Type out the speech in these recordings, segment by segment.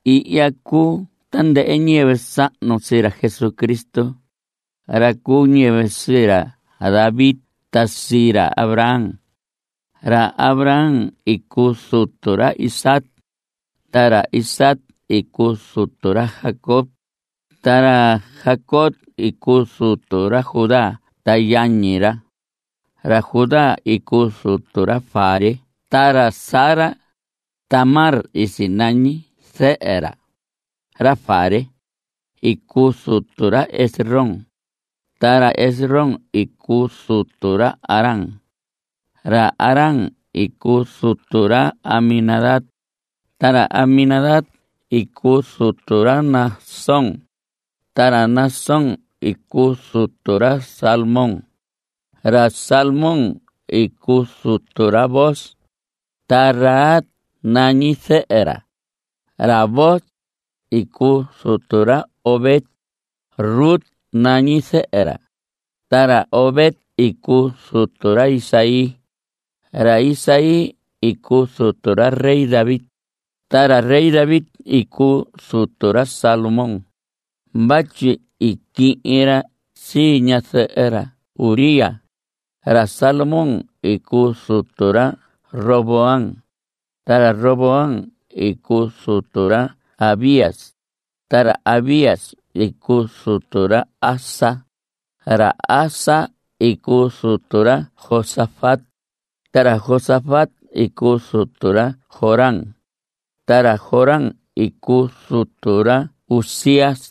Ihya cuu tandɨhɨ ñiyɨvɨ sahnu sii ra Jesucristo, ra cu ñiyɨvɨ sii ra David ta sii ra Abraham. Ra Abraham i cuu zutu ra Isaac. Ta ra Isaac i cuu zutu ra Jacob. Ta ra Jacob i cuu zutu ra Judá ta yañi ra. Ra Judá i cuu zutu ra Fares ta ra Zara. Tamar i sinañi zɨhɨ ra. Ra Fares i cuu zutu ra Esrom. Ta ra Esrom i cuu zutu ra Aram. Ra Aram i cuu zutu ra Aminadab. Ta ra Aminadab i cuu zutu ra Naasón. Ta ra Naasón i cuu zutu ra Salmón. Ra Salmón i cuu zutu ra Booz. Ta Rahab nañi zɨhɨ ra. Ra Booz i cuu zutu ra Obed. Rut nañi zɨhɨ ra. Ta ra Obed i cuu zutu ra Isaí. Ra Isaí i cuu zutu ra rey David. Ta ra rey David i cuu zutu ra Salomón vatyi i quihin ra sii ñazɨhɨ ra Urías. Ra Salomón i cuu zutu ra Roboam. Ta Roboam i cuu zutu ra Abías. Ra Abías i cuu zutu ra Asa. Ra Asa i cuu zutu ra Josafat. Ta ra Josafat i cuu zutu ra Joram. Ta ra Joram i cuu zutu ra Uzías.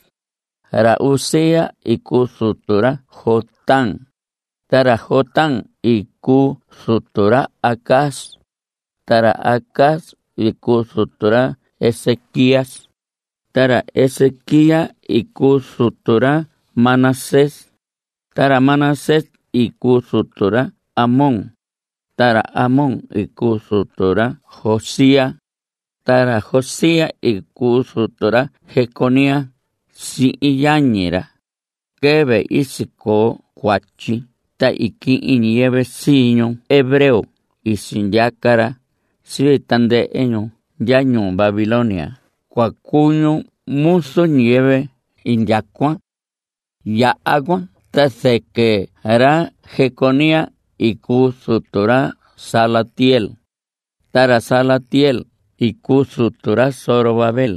Ra Uzías i cuu zutu ra Jotam. Ta ra Jotam i cuu zutu ra Acaz. Ta ra Acaz i cuu zutu ra Ezequías. Ra Ezequías i cuu zutu ra Manasés. Ta ra Manasés i cuu zutu ra Amón. Ta ra Amón i cuu zutu ra Josías. Ta ra Josías i cuu zutu ra Jeconías sihin yañi ra quɨvɨ i sicoo cuatyi ta i quihin ñiyɨvɨ sii ñu hebreo sindyaca ra sii tandɨhɨ ñu ndya ñuu Babilonia cua cuu ñu muzu ñiyɨvɨ indyacuan. Yaha cuan ta zɨquɨ ra Jeconías i cuu zutu ra Salatiel. Ta ra Salatiel i cuu zutu ra Zorobabel.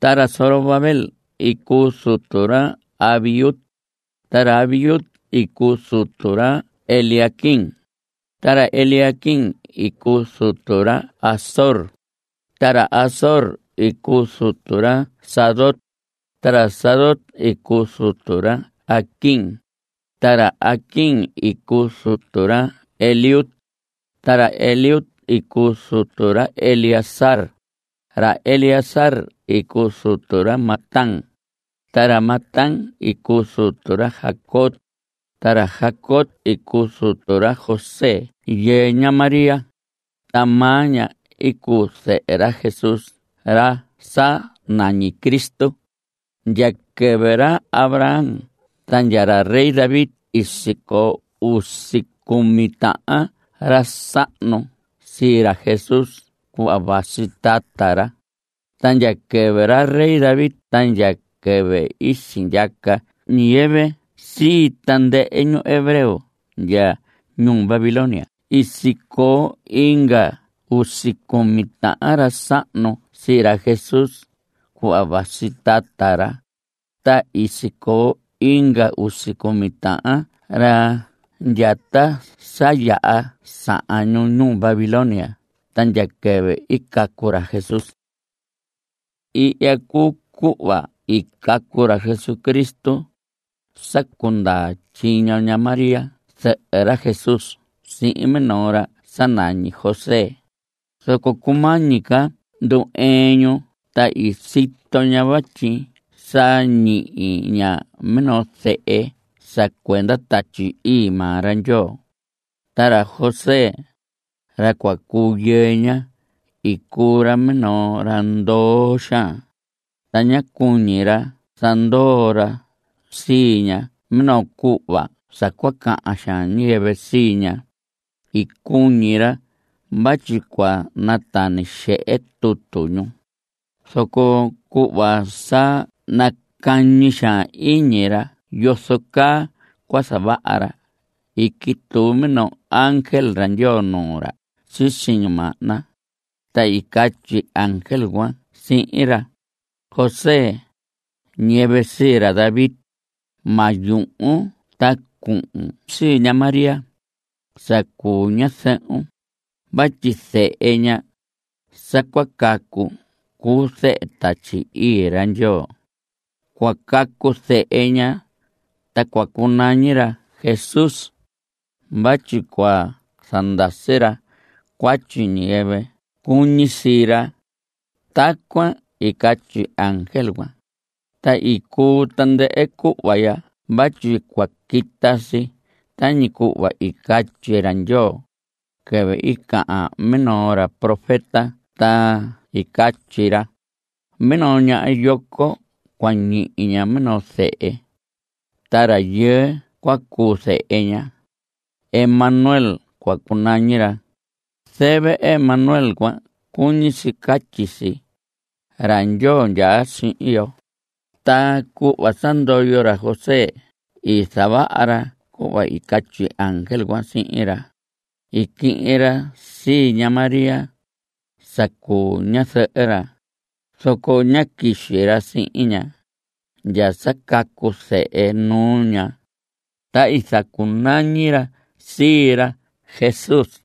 Ta ra Zorobabel i cuu zutu ra Abiud. Ta ra Abiud i cuu zutu ra Eliaquim. Ta ra Eliaquim i cuu zutu ra Azor. Ta ra Azor i cuu zutu ra Sadoc, ta ra Sadoc i cuu zutu ra Aquim. Ta ra Aquim i cuu zutu ra Eliud. Ra Eliud i cuu zutu ra Eleazar. Ra Eleazar i cuu zutu ra Matán. Ra Matán i cuu zutu ra Jacob, ta ra Jacob i cuu zutu ra José yɨɨ ña María. Ta maa ña i cuu zɨhɨ ra Jesús ra sa nañi Cristo. Ndya quɨvɨ ra Abraham ta ndya ra David i sicoo usi cumi tahan ra sahnu sii ra Jesús cuhva vasi tata ra. Ta ndya quɨvɨ ra David ta ndya quɨvɨ i sindyaca ñiyɨvɨ sii tandɨhɨ ñu hebreo ndya ñuu Babilonia i sicoo inga usi cumi tahan ra sahnu sii ra Jesús cuhva vasi tata ra. Ta i sicoo inga usi cumi tahan ra ndya ta sa yaha sahan ñu ñuu Babilonia ta ndya quɨvɨ i cacu ra Jesús. Ihya cuu cuhva i cacu ra Jesucristo. Sa cundaa tyiño ña María zɨhɨ ra Jesús sihin minoo ra sa nañi José, zoco cumañi ca ndu‑ɨɨn ñu ta i sito ña vatyi sa ñihi ña minoo zehe sa cuenda Tatyi Ii maa ra Ndyoo. Ta ra José, ra cua cuu yɨɨ ña, i cuu ra minoo ra ndoo xaan, ta ñá cuñi ra zandoo ra sii ña minoo cuhva sa cua cahan xaan ñiyɨvɨ sii ña. I cuñi ra vatyi cua natani xehe tutu ñu. Zoco cuhva sa nacañi xaan iñi ra yozo caa cua zavaha ra, i quituu minoo ángel ra Ndyoo nuu ra sisi ñimahna, ta i catyi ángel cuan sihin ra: José, ñiyɨvɨ sii ra David, ma yuhun ta cuhun sii ña María sa cuu ña ñazɨhun vatyi zehe ña sa cua cacu cuu zehe Tatyi Ii ra Ndyoo. Cua cacu zehe ña. Ta cua cunañi ra Jesús vatyi cua zandasi ra cuatyi ñiyɨvɨ cuñi sii ra. Tacuan i catyi ángel. Ta i cuu tandɨhɨ cuhva ya vatyi cua quita si tañi cuhva i catyi ra Ndyoo quɨvɨ i cahan minoo ra profeta ta i catyi ra: Minoo ñaha yoco, cua ñihi ña minoo zehe, ta rayɨɨ cua cuu zehe ña. Emanuel cua cunañi ra. Zɨvɨ Emanuel cuan cuñi si catyi si: Ra Ndyoo ndyaa sihin yo. Ta cuhva sa ndoyo ra José i zavaha ra cuhva i catyi ángel cuan sihin ra. I quihin ra sii ña María sa cuu ña ñazɨhɨ ra. Zoco ñá quixi ra sihin ña ndya sa cacu zehe nuu ña. Ta i zacunañi ra sii ra Jesús.